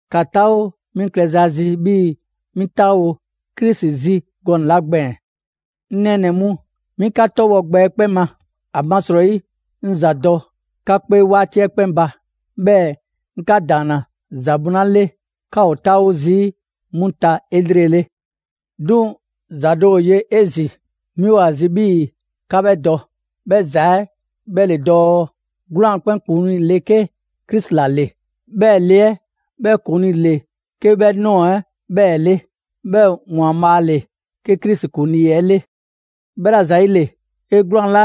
‑Ka 'taawo 'mi klɛza zi 'bhii‑ 'mi 'taawo Krisi zi gɔnɛ‑ 'la gbɛɛn‑. 'Ŋ nɛɛ ‑nɛ mu, 'mi 'ka 'tɔbhɔ‑ gbɛ 'ɛ 'kpɛn ma, ‑amasrɔyi 'ŋ ‑za dɔ 'ka 'kpee 'waati 'ɛ 'kpɛn ba, 'bhɛɛ‑ 'ŋ 'ka ‑daanna ‑za mu 'la 'le, 'ka ‑o 'taawo zii' 'mu ta 'elrele. 'Duŋ‑ ‑za do ‑o ye 'ezin‑, 'mi ‑o ‑a zi 'bhii‑ 'ka 'bhɛ dɔ, 'bhɛ ‑za 'ɛ 'bhɛ ‑le dɔɔ: 'gwlaan‑ 'kpɛn ‑kuŋlii ‑le 'ke Krisi ‑la ‑le, 'bhɛɛ‑ le 'ɛ 'bhɛ ‑kuŋlii ‑le 'ke 'bhɛ ꞊nɔɔ 'ɛ 'bhɛɛ‑ 'le; 'bhɛɛ‑ ‑Waanbhaa' ‑le 'ke Krisi ‑kuŋlii' 'ɛ 'le. 'Bhɛla‑ ‑zayile, 'ke 'gwlaan‑ 'la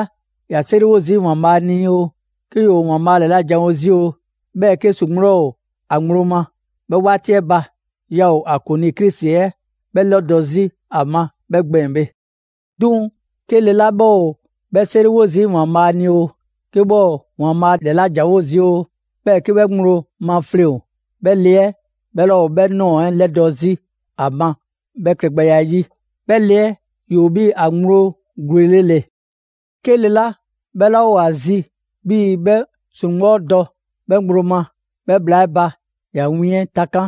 ‑ya 'seriwo zii' ‑Waanbhaa' ni oo, 'ke ‑yoo ‑Waanbhaa' ‑lɛlajanwo zii' oo; 'bhɛɛ‑ 'ke ‑sruŋgbɔɔ' ‑o ‑a ŋgblo ma 'bhɛ 'waati 'ɛ ba, yaa ‑o ‑a ‑kuŋlii Krisi 'bhɛ 'lɛdɔ‑ 'zi ‑a ma 'bhɛ gbɛɛn‑ bhe. 'Duŋ‑ 'ke le 'la 'bhɛ ‑o 'bhɛ 'seriwo zii' ‑Waanbhaa' ni oo, 'ke 'bhɛ ‑o ‑Waanbhaa' ‑lɛlajanwo zii' oo, 'bhɛɛ‑ 'ke 'bhɛ ŋgblo ma fleŋ‑ ‑o, 'bhɛ le 'ɛ 'bhɛ 'laa ‑o 'bhɛ ꞊nɔɔ 'ɛ 'lɛdɔ‑ 'zi 'a ma 'bhɛ klɛgbɛya 'ɛ 'yi. 'Bhɛ le 'ɛ ‑yoo 'bhii‑ ‑a ŋgblo ‑gwele' ‑le. 'Ke le 'la 'bhɛ 'laa ‑o ‑a zi 'bhii‑ 'bhɛ ‑sruŋgbɔɔ' dɔ 'bhɛ ŋgblo ma, 'bhɛ bhla 'ɛ ba, ‑ya win 'ɛ takan!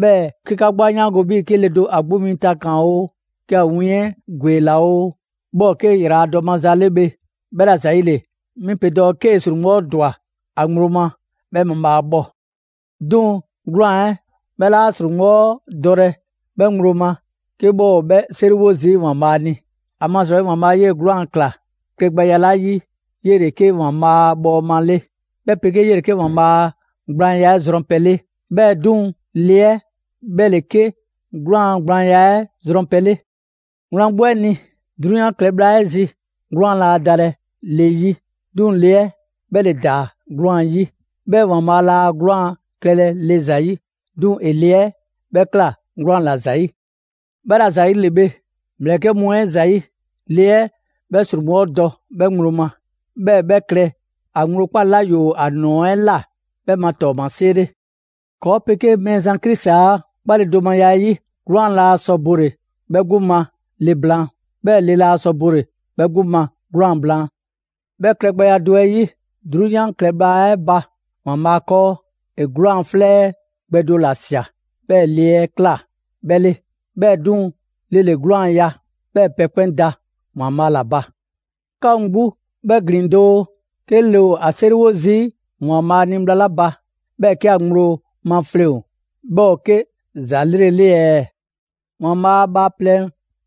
'Bhɛɛ‑ 'ke 'ka 'gbu 'a 'yaango‑ 'bhii‑ 'ke le do ‑a 'gbu 'win takaan‑ oo, 'ke ‑ya win 'ɛ ‑gwela oo, 'bhɛ ‑o 'ke ‑yraladɔ maza 'le bhe. 'Bhɛla‑ ‑zayile, 'mi pe dɔɔ 'kee‑ ‑sruŋgbɔɔ' ꞊dwa ‑a ŋgblo ma 'bhɛ mabhaabhɔ. 'Duŋ‑, 'gwlaan‑ 'ɛ 'bhɛ 'laa ‑sruŋgbɔɔ' dɔlɛ 'bhɛ ŋgblo ma 'ke 'bhɛ ‑o 'bhɛ 'seriwo zii' ‑Waanbhaa' ni. ‑Amasrɔyi ‑Waanbhaa' 'yee‑ 'gwlaan‑ ꞊kla klɛgbɛya 'la 'yi 'yele‑ 'ke ‑Waanbhaa' bhɔɔma 'le, 'bhɛ 'pegee 'yele‑ 'ke ‑Waanbhaa' a gblaanya 'ɛ zrɔn pɛ 'le. 'Bhɛɛ‑ 'duŋ‑, le 'ɛ 'bhɛ ‑le 'ke 'gwlaan‑ a gblaanya 'ɛ zrɔnpɛ 'le. Wlan 'gbu 'ɛ ni, 'drunyan klɛ bhla 'ɛ zi, 'gwlaan‑ laa dalɛ le 'yi, 'duŋ‑ le 'ɛ 'bhɛ ‑le ‑daa 'gwlaan‑ 'yi. 'Bhɛɛ‑ ‑Waanbhaa' 'laa 'gwlaan‑ klɛlɛ le ‑zayi', 'duŋ‑ ‑e le 'ɛ 'bhɛ ꞊kla 'gwlaan‑ ‑la ‑zayi'. 'Bhɛla‑ ‑zayile bhe, ‑mlɛkɛ' mu 'ɛ ‑zayi', le 'ɛ 'bhɛ ‑sruŋgbɔɔ' dɔ 'bhɛ ŋgblo ma; 'bhɛɛ‑ 'bhɛ klɛ ‑a ŋgblo 'kpaale‑ 'la ‑yoo ‑a ‑nɔɔ ꞊la bhe 'bhɛ ‑tɔɔmasie 'le. ‑Kɔɔ' 'pegee Mɛɛzan Krisi a 'kpaledomaya 'ɛ 'yi, 'gwlaan‑ laa sɔ bole‑ 'bhɛ 'gbu ma le blaan; 'bhɛɛ‑ le laa sɔ bole‑ 'bhɛ 'gbu ma 'gwlaan‑ blaan. 'Bhɛ klɛgbɛya do 'ɛ yi, 'drunyan klɛ 'waati 'ɛ ba ‑Waanbhaa' 'kɔɔ, ‑e 'gwlaan‑ 'flɛ 'ɛ gbɛ do ‑la ꞊sia, 'bhɛɛ‑ ‑e le ꞊kla 'bhɛ 'le; 'bhɛɛ‑ 'duŋ‑ le ‑le 'gwlaan‑ ya. 'Bhɛɛ‑ pɛ 'kpɛn da ‑Waanbhaa' ‑la ba. 'Ka mu 'gbu 'bhɛ ‑glin doo, 'ke le ‑o ‑a 'seriwo zii' ‑Waanbhaa' ni bhla 'la ba, 'bhɛɛ‑ 'ke ‑a ŋgblo ma fleŋ‑ ‑o, 'bhɛ ‑o 'ke ‑za 'lrele‑ 'le ɛɛ? ‑Waanbhaa' a bhaaplɛŋ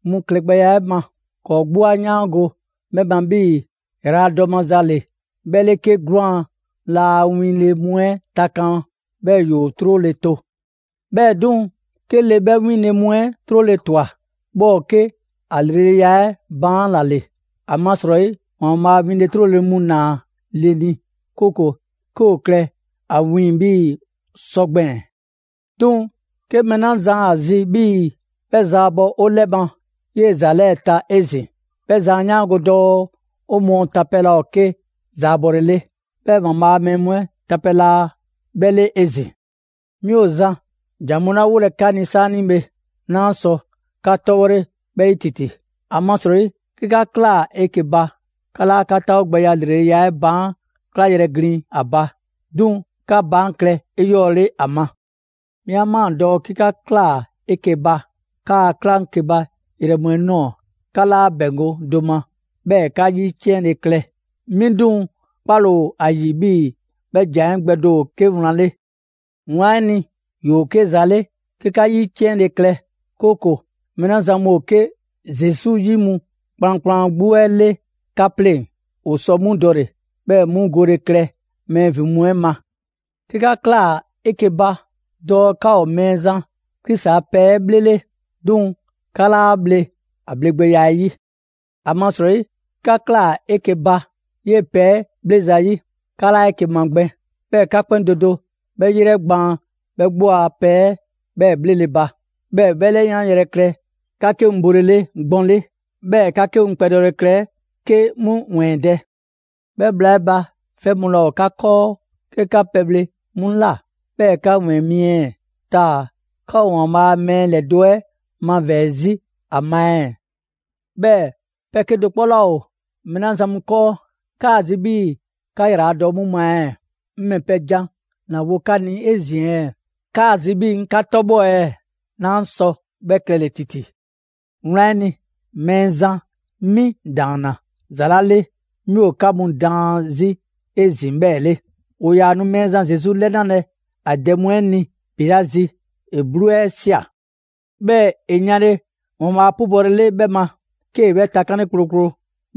mu klɛgbɛya 'ɛ ma, ‑kɔɔ' 'gbu 'a 'yaango‑ 'bhɛ ma 'bhii‑ ‑yraladɔ maza ‑le 'bhɛ 'le 'ke 'gwlaan‑ laa a 'winle‑ mu 'ɛ takan 'bhɛɛ‑ ‑yoo 'trole‑ to. 'Bhɛɛ‑ 'duŋ‑, 'ke le 'bhɛ 'winle‑ mu 'ɛ 'trole‑ ꞊twa, 'bhɛ ‑o 'ke ‑a ‑lreleya 'ɛ baan' ‑la ‑le. ‑Amasrɔyi ‑Waanbhaa' winle 'trole‑ mu ‑naa le ni, 'kooko‑ 'ke ‑o klɛ ‑a wiiŋ‑ 'bhii‑ sɔ gbɛɛn‑. 'Duŋ‑ 'ke mɛɛ 'la zan ‑a zi 'bhii‑ 'bhɛ zaabɔ 'o 'lɛ ma 'yee‑ ‑za 'lɛɛ‑ ta 'ezin‑, 'bhɛ zan 'a 'yaango‑ dɔɔ 'o mɔɔ ta pɛ laa ‑o 'ke zaabɔlele, 'bhɛɛ‑ ‑Waanbhaa' a mɛɛ ‑lɛdo' mu 'ɛ ta pɛ laa 'bhɛ 'le 'ezin‑. 'Mi ‑o zan ‑jan mu 'la 'wolɛ‑ 'ka ni 'saanibhe, 'naa sɔ 'ka 'tɔbhɔle 'bhɛ 'yi ‑titi. ‑Amasrɔyi, 'ke 'ka ꞊klaa 'eke‑ ba, 'ka 'laa 'ka 'taawogbɛya 'lreleya 'ɛ baan' 'kla yrɛ glin ‑a ba, 'duŋ‑ 'ka baan' klɛ 'eyɔɔle ‑a ma. 'Mi 'a ꞊maa dɔɔ 'ke 'ka ꞊klaa 'eke‑ ba 'kaa‑ ꞊klaŋkeba yrɛ mu 'ɛ ꞊nɔɔ, 'ka 'laa ‑bɛŋgo' do ma, 'bhɛɛ‑ 'ka 'yiciɛnle klɛ. 'Mi 'duŋ‑ 'kpale‑ ‑o ‑a ‑yi 'bhii‑ 'bhɛ ‑jan 'ɛ gbɛ do ‑o 'ke wlan 'le. Wlan 'ɛ ni, ‑yoo 'ke ‑za 'le 'ke 'ka 'yiciɛnle klɛ, 'kooko‑ mɛɛ 'la zan mu ‑o 'ke Zesu 'yi mu kplankplan 'gbu 'ɛ 'le 'ka 'pleŋ‑, ‑o sɔ 'mu dɔle‑, 'bhɛɛ‑ 'mu gole klɛ mɛɛ ‑vin mu 'ɛ ma. 'Ke 'ka ꞊klaa 'eke‑ ba dɔɔ 'ka ‑o Mɛɛzan Krisi a pɛle 'ɛ 'bhlele, 'duŋ‑ 'ka 'laa ‑a bhle ‑a bhle gbɛya 'ɛ 'yi. ‑Amasrɔyi 'ke 'ka ꞊klaa 'eke‑ ba 'yee‑ pɛ 'ɛ 'bhle zayi', 'ka 'laa 'eke‑ magbɛn. 'Bhɛɛ‑ 'ka 'kpɛn do do 'bhɛ 'yrɛ gbaan 'bhɛ 'gbu a pɛ 'ɛ 'bhɛɛ‑ 'bhlele‑ ba. 'Bhɛɛ‑ 'bhɛ 'lɛyanyrɛ klɛ 'ka 'ke mu bolele gbɔn ‑le, 'bhɛɛ‑ 'ka 'ke mu kpɛdɔle klɛ, 'ke 'mu ‑wɛɛndɛ'. 'Bhɛ bhla 'ɛ ba, 'fɛ mu laa ‑o 'ka 'kɔɔ, 'ke 'ka pɛbhle 'mu ꞊la, 'bhɛɛ‑ 'ka ‑wɛɛn mi ɛɛ? Taa‑ 'ka ‑o ‑Waanbhaa' a mɛɛ ‑lɛdo' 'ɛ mavɛɛ‑ 'zi ‑a ma ɛɛ? 'Bhɛɛ‑ pɛ 'kedo‑ laa ‑o mɛɛ 'la zan mu 'kɔɔ, 'kaa‑ zi 'bhii‑ 'ka ‑yraladɔ 'mu ma ɛɛ? 'Ŋ ‑mɛ pɛ jan ‑la wo 'ka ni 'ezin‑ ɛɛ? 'Kaa‑ zi 'bhii‑ 'ŋ 'ka 'tɔbhɔ ɛɛ? 'Naa sɔ 'bhɛ klɛle‑ ‑titi! Wlan 'ɛ ni, Mɛɛzan 'mi ‑daanna ‑za 'la 'le, 'mi ‑o 'ka mu daan 'zi 'ezin‑ 'bhɛɛ‑ 'le. ‑O ‑yaa nu Mɛɛzan Zesu ‑lɛnalɛ ‑a dɛ mu 'ɛ ni ‑bi 'la zi, ‑e 'bluu 'ɛ ꞊sia. 'Bhɛɛ‑ ‑e 'yanle‑ ‑Waanbhaa' 'pubɔlele 'bhɛ ma, 'kee‑ 'bhɛ takanle kplokplo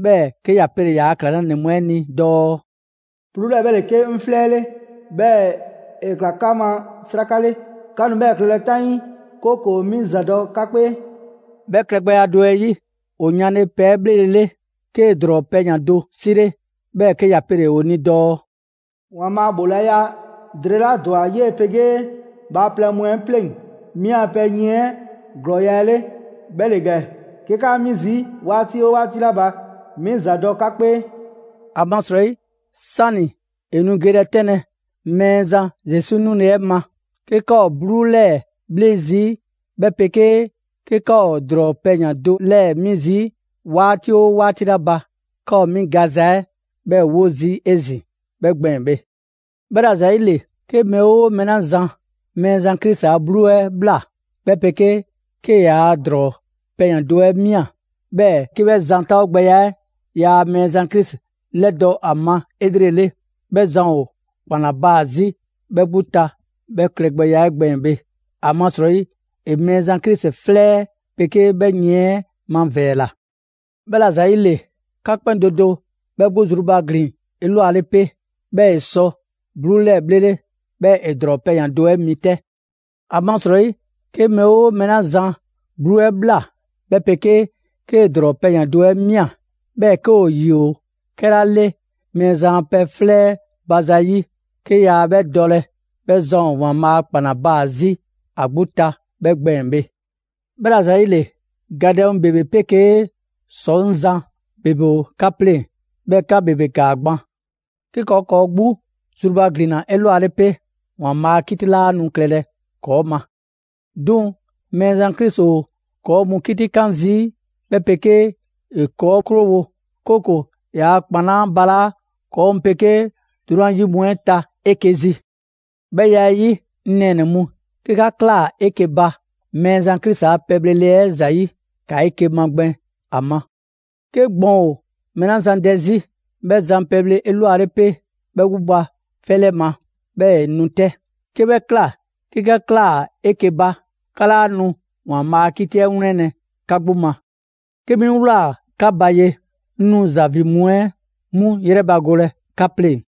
'bhɛɛ‑ 'ke ‑ya pele‑ ‑yaa' ‑klaŋlanɛ mu 'ɛ ni dɔɔ: «'bluu 'lɛɛ‑ 'bhɛ ‑le 'ke 'ŋ 'flɛ 'ɛ 'le, 'bhɛɛ‑ ‑e ꞊kla 'ka ma 'sraka 'le. 'Ka nu 'bhɛɛ‑ klɛlɛ 'taŋii, 'kooko‑ 'mi ‑za dɔ 'ka 'kpee.» 'Bhɛ klɛgbɛya do 'ɛ 'yi, ‑o yanle pɛ 'ɛ 'bhlelele, 'kee‑ ‑drɔɔ pɛyan‑ do 'sile, 'bhɛɛ‑ 'ke ‑ya pele‑ ‑o ni dɔɔ: «‑Waanbhaa' ‑bhoolaya drɛɛ 'la ‑dwa 'yee‑ 'pegee bhaaplɛŋ mu 'ɛ pleŋ‑ 'mi a pɛ yiɛn 'ɛ ‑glɔɔya' 'ɛ 'le, 'bhɛ ‑le ‑gɛ. 'Ke 'kaa‑ mi 'zi 'waati oo 'waati 'la ba, 'mi ‑za dɔ 'ka 'kpee.» ‑Amasrɔyi 'sani‑ ‑e nu gelɛ 'tɛnlɛ‑ Mɛɛzan Zesu 'nule‑ 'ɛ ma, 'ke 'ka ‑o 'bluu 'lɛɛ‑ 'bhle zii', 'bhɛ 'pegee 'ke 'ka ‑o ‑drɔɔ pɛyan‑ do 'lɛɛ‑ 'mi zii' 'waati 'oo 'waati 'la ba, 'ka ‑o 'mi gaza 'ɛ 'bhɛɛ‑ 'wo zii' 'ezin‑ 'bhɛ gbɛɛn‑ bhe. 'Bhɛla‑ ‑zayile, 'ke mɛɛ 'oo mɛɛ 'la zan Mɛɛzan Krisi a 'bluu 'ɛ ꞊bhla, 'bhɛ 'pegee 'kee‑ ‑yaa' ‑drɔɔ pɛyan‑ do 'ɛ ꞊mia, 'bhɛɛ‑ 'ke 'bhɛ zan 'taawogbɛya 'ɛ yaa Mɛɛzan Krisi 'lɛdɔ‑ ‑a ma 'elrele, 'bhɛ zan ‑o ‑kpan ‑la baa‑ 'zi 'bhɛ 'gbu ta 'bhɛ klɛgbɛya 'ɛ gbɛɛn‑ bhe, ‑amasrɔyi ‑e Mɛɛzan Krisi 'flɛ 'ɛ 'pegee 'bhɛ yiɛn 'ɛ mavɛɛla. 'Bhɛla‑ ‑zayile, 'ka 'kpɛn do do 'bhɛ 'gbu zrubaglin 'elwale pe, 'bhɛɛ‑ ‑e sɔ 'bluu 'lɛɛ‑ 'bhlele, 'bhɛɛ‑ ‑e ‑drɔɔ pɛyan‑ do 'ɛ mi 'tɛ. ‑Amasrɔyi 'ke mɛɛ 'oo mɛɛ 'la zan 'bluu 'ɛ ꞊bhla, 'bhɛ 'pegee 'kee‑ ‑drɔɔ pɛyan‑ do 'ɛ ꞊mia, 'bhɛɛ‑ 'ke ‑o ‑yi ‑o 'kɛla 'le Mɛɛzan a pɛ 'flɛ 'ɛ ba zayi' 'ke yaa 'bhɛ dɔlɛ; 'bhɛ zan ‑o ‑Waanbhaa' a ‑kpan ‑la baa‑ 'zi ‑a 'gbu ta 'bhɛ gbɛɛn‑ bhe. 'Bhɛla‑ ‑zayile, gadɛ mu ‑bebe 'pegee ‑sɔŋzan' ‑bebe ‑o 'ka 'pleŋ‑, 'bhɛɛ‑ 'ka ‑bebe ‑gaa gban. 'Ke ‑kɔɔ' ‑kɔɔ' 'gbu zrubaglinna 'elwale 'pe, ‑Waanbhaa' a 'kiti 'laa nu klɛlɛ ‑kɔɔ' ma. 'Duŋ‑ Mɛɛzan Krisi ‑o ‑kɔɔ' mu 'kitikan zii' 'bhɛ 'pegee ‑e ‑kɔɔ' 'krowo, 'kooko‑ ‑yaa' ‑kpan 'laa balaa' ‑kɔɔ' mu 'pegee 'drunyan 'yi mu 'ɛ ta 'eke‑ zi. 'Bhɛ ya 'ɛ 'yi, 'ŋ nɛɛnɛ‑ mu, 'ke 'ka ꞊klaa 'eke‑ ba Mɛɛzan Krisi a pɛle 'ɛ 'bhle zayi', ‑ka 'eke‑ magbɛn ‑a ma. 'Ke gbɔn ‑o mɛɛ 'la zan dɛ 'zi, 'bhɛ zan pɛbhle 'elwale 'pe 'bhɛ 'gbu ba 'fɛ 'lɛ ma, 'bhɛɛ‑ ‑e nu 'tɛ. 'Ke 'bhɛ ꞊kla, 'ke 'ka ꞊klaa 'eke‑ ba, 'ka 'laa nu ‑Waanbhaa' a 'kiti 'ɛ 'wlɛnlɛ‑ 'ka 'gbu ma. 'Ke 'mi ꞊wlaa 'ka ba ye, 'ŋ nu ‑za ‑vin mu 'ɛ 'mu ‑yrɛbagolɛ 'ka 'pleŋ‑.